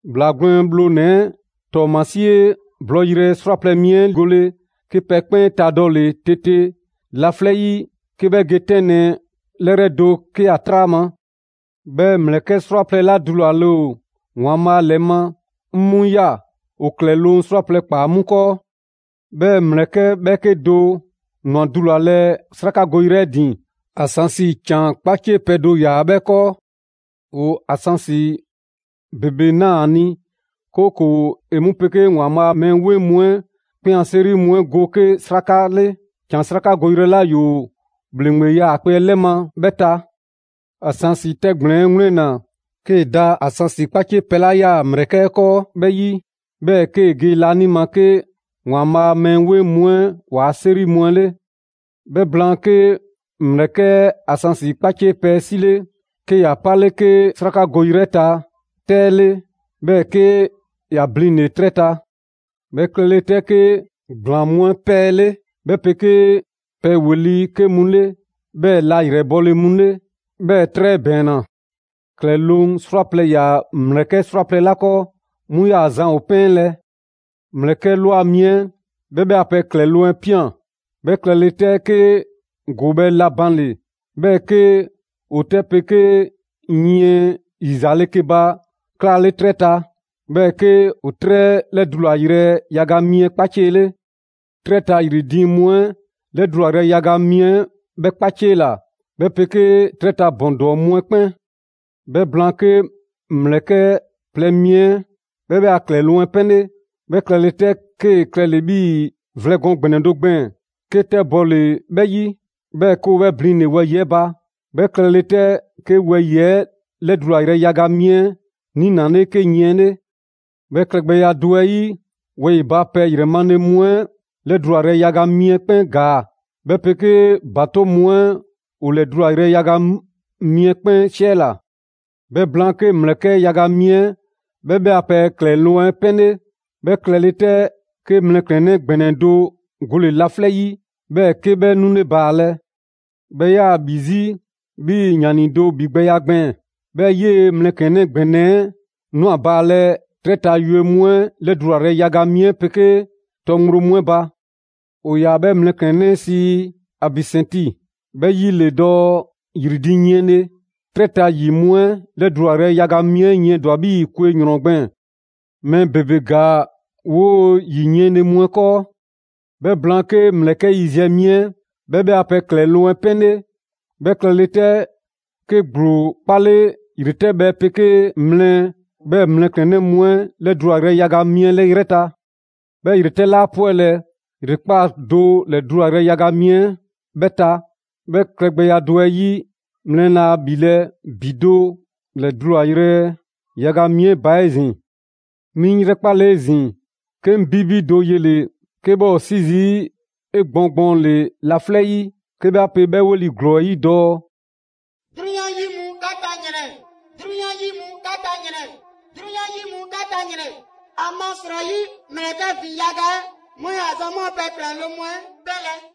‑Bhlaa Gwlɛn Bhlonɛ‑ 'ɛ ‑tɔɔmasie blɔɔyrɛ 'srwaplɛ‑ mi 'ɛ gole, 'ke pɛ 'kpɛn 'e tadɔle 'tete laflɛ' 'yi 'ke 'bhɛ ge 'tɛnlɛ‑ 'lɛrɛ do 'ke ‑a 'traa ma. 'Bhɛɛ‑ ‑mlɛkɛ' 'srwaplɛ‑ 'la dulale ‑o ‑Waanbhaa' ‑lɛ ma, 'ŋ 'mu ꞊ya; ‑o ‑klɛloŋ' 'srwaplɛ‑ ꞊kpaa 'mu 'kɔɔ. 'Bhɛɛ‑ ‑mlɛkɛ' ‑bhɛɛke' do ‑nwa dulalɛ 'srakagoyrɛ 'ɛ ‑din; ansansi ‑can 'kpaciepɛ do ‑yaa 'bhɛ 'kɔɔ. ‑O ansansi ‑bebe ꞊naa‑ ‑a ni, 'kooko‑ ‑e 'mu 'pegee ‑Waanbhaa' a mɛɛ 'weŋ mu 'ɛ 'kpɛn a 'seri mu 'ɛ go 'ke 'sraka 'le ‑can 'srakagoyrɛ 'la ‑yoo ‑bhleŋgbe 'yaakpe‑ 'ɛ 'lɛ ma 'bhɛ ta. Ansansi 'ɛ 'tɛgblɛn‑ 'ɛ 'wlɛnna 'kee‑ da ansansi 'kpaciepɛ 'la 'yaa‑ ‑mlɛkɛ' 'ɛ 'kɔɔ 'bhɛ 'yi, 'bhɛɛ‑ 'kee‑ ge laanima 'ke ‑Waanbhaa' a mɛɛ 'weŋ mu 'ɛ ‑waa' 'seri mu 'ɛ 'le. 'Bhɛ blaan, 'ke ‑mlɛkɛ' 'ɛ ansansi 'kpaciepɛ 'ɛ 'sile, 'ke ‑ya 'pale 'ke 'srakagoyrɛ 'ɛ ta 'tɛ 'ɛ 'le, 'bhɛɛ‑ 'ke ‑ya blinle‑ 'trɛ ta. 'Bhɛ klɛle 'tɛ, 'ke ‑gblaan mu 'ɛ 'pɛɛle, 'bhɛ 'pegee pɛ ‑weli' 'ke mu 'le, 'bhɛɛ‑ la ‑yrɛbɔle mu 'le. 'Bhɛɛ‑ 'trɛ ‑bɛɛnna. ‑Klɛloŋ' 'srwaplɛ‑ ‑yaa ‑mlɛkɛ' 'srwaplɛ‑ 'la 'kɔɔ, 'mu 'yaa‑ zan ‑o 'pɛnlɛ‑. ‑Mlɛkɛ' ꞊lwa mi 'ɛ 'bhɛ 'bhɛ a pɛ ‑Klɛloŋ' 'ɛ ꞊pian. 'Bhɛ klɛle 'tɛ, 'ke ‑goobhɛ' la banle‑, 'bhɛɛ‑ 'ke ‑o 'tɛ 'pegee yiɛn ‑yizaale ke ba 'klaale 'trɛ ta. 'Bhɛɛ‑ 'ke ‑o 'trɛ 'ɛ 'lɛdulayrɛ yaga mi 'ɛ 'kpaciele. 'Trɛ ta ‑yri diiŋ mu 'ɛ 'lɛdulayrɛ yaga mi 'ɛ 'bhɛ 'kpaciela, 'bhɛ 'pegee 'trɛ ta ‑bɔn ‑dɔɔ mu 'ɛ 'kpɛn. 'Bhɛ blaan, 'ke ‑mlɛkɛ' plɛ mi 'ɛ 'bhɛ 'bhɛ a ‑Klɛloŋ' 'ɛ 'pɛnle. 'Bhɛ klɛle 'tɛ, 'kee‑ klɛle‑ 'bhii‑ vlɛ gɔɔn ‑gbɛnɛ do gbɛɛn‑ 'ke 'tɛ bɔle‑ 'bhɛ 'yi, 'bhɛɛ‑ 'ke ‑o 'bhɛ blinle‑ wɛyi‑ 'ɛ ba. 'Bhɛ klɛle 'tɛ, 'ke wɛyi‑ 'ɛ 'lɛdulayrɛ yaga mi 'ɛ 'niinale 'ke yiɛn 'le. 'Bhɛ klɛgbɛya do 'ɛ 'yi, wɛyi‑ ba pɛ ‑yrɛ male mu 'ɛ 'lɛdulayrɛ yaga mi 'ɛ 'kpɛn ‑gaa; 'bhɛ 'pegee ‑batoŋ' mu 'ɛ ‑o ‑lɛdulayrɛ yaga mi 'ɛ 'kpɛn 'siɛla‑. 'Bhɛ blaan, 'ke ‑mlɛkɛ' yaga mi 'ɛ 'bhɛ 'bhɛ a pɛ ‑klɛloŋ' 'ɛ 'pɛnle. 'Bhɛ klɛle 'tɛ, 'ke mlɛklɛnnɛ ‑gbɛnɛ do gole‑ laflɛ' 'yi, 'bhɛɛ‑ 'ke 'bhɛ 'nule baalɛ. 'Bhɛ 'yaa‑ ‑bhi 'zi 'bhii‑ ‑yani do ‑bhigbɛya gbɛɛn‑. 'Bhɛɛ‑ 'yee‑ mlɛklɛnnɛ ‑gbɛnɛ 'ɛ ꞊nwa baalɛ 'trɛ ta yue mu 'ɛ 'lɛdulayrɛ yaga mi 'ɛ 'pegee tɔ ŋgblo mu 'ɛ ba. ‑O ‑yaa 'bhɛ mlɛklɛnnɛ 'ɛ sii: «Abisɛnti». 'Bhɛ 'yi ‑le dɔɔ «‑Yri diiŋ yiɛnle». 'Trɛ ta ‑yi mu 'ɛ 'lɛdulayrɛ yaga mi 'ɛ yiɛndwa‑ 'bhii‑ kwe ‑yrɔn gbɛɛn‑. Mɛɛ ‑bebe ‑gaa 'woo‑ ‑yi yiɛnle mu 'ɛ 'kɔɔ. 'Bhɛ blaan, 'ke ‑mlɛkɛ' yiziɛ mi 'ɛ 'bhɛ 'bhɛ a pɛ ‑klɛloŋ' 'ɛ 'pɛnle. 'Bhɛ klɛle 'tɛ, 'ke ‑gblo 'kpale ‑yretɛbhɛ 'pegee mlɛ 'bhɛɛ‑ mlɛklɛnnɛ mu 'ɛ 'lɛdulayrɛ yaga mi 'ɛ 'yrɛ ta. 'Bhɛɛ‑ ‑yretɛ' laa 'pwɛlɛ‑ ‑yrekpaa' do ‑lɛdulayrɛ yaga mi 'ɛ 'bhɛ ta; 'bhɛ klɛgbɛya do 'ɛ 'yi, mlɛ laa ‑bhilɛ' ‑bi do ‑lɛdulayrɛ yaga mi 'ɛ ba 'ezin‑. 'Mi 'ŋ 'yrɛkpale 'ezin‑, 'ke 'ŋ 'bibi do yele‑ 'ke 'bhɛ ‑o 'si zii' 'egbɔɔn gbɔɔnle' laflɛ' 'yi, 'ke 'bhɛ 'a pe 'bhɛ 'weli‑ ‑glɔɔ 'ɛ 'yi dɔɔ: «'Drunyan 'yi mu 'ka ta ‑yrɛn! 'Drunyan 'yi mu 'ka ta ‑yrɛn! 'Drunyan 'yi mu 'ka ta ‑yrɛn! ‑Amasrɔyi ‑mlɛkɛ' ‑vin yaga 'ɛ 'mu 'yaa‑ zan 'mu a pɛ ‑klɛloŋ' mu 'ɛ 'pɛnlɛ‑!»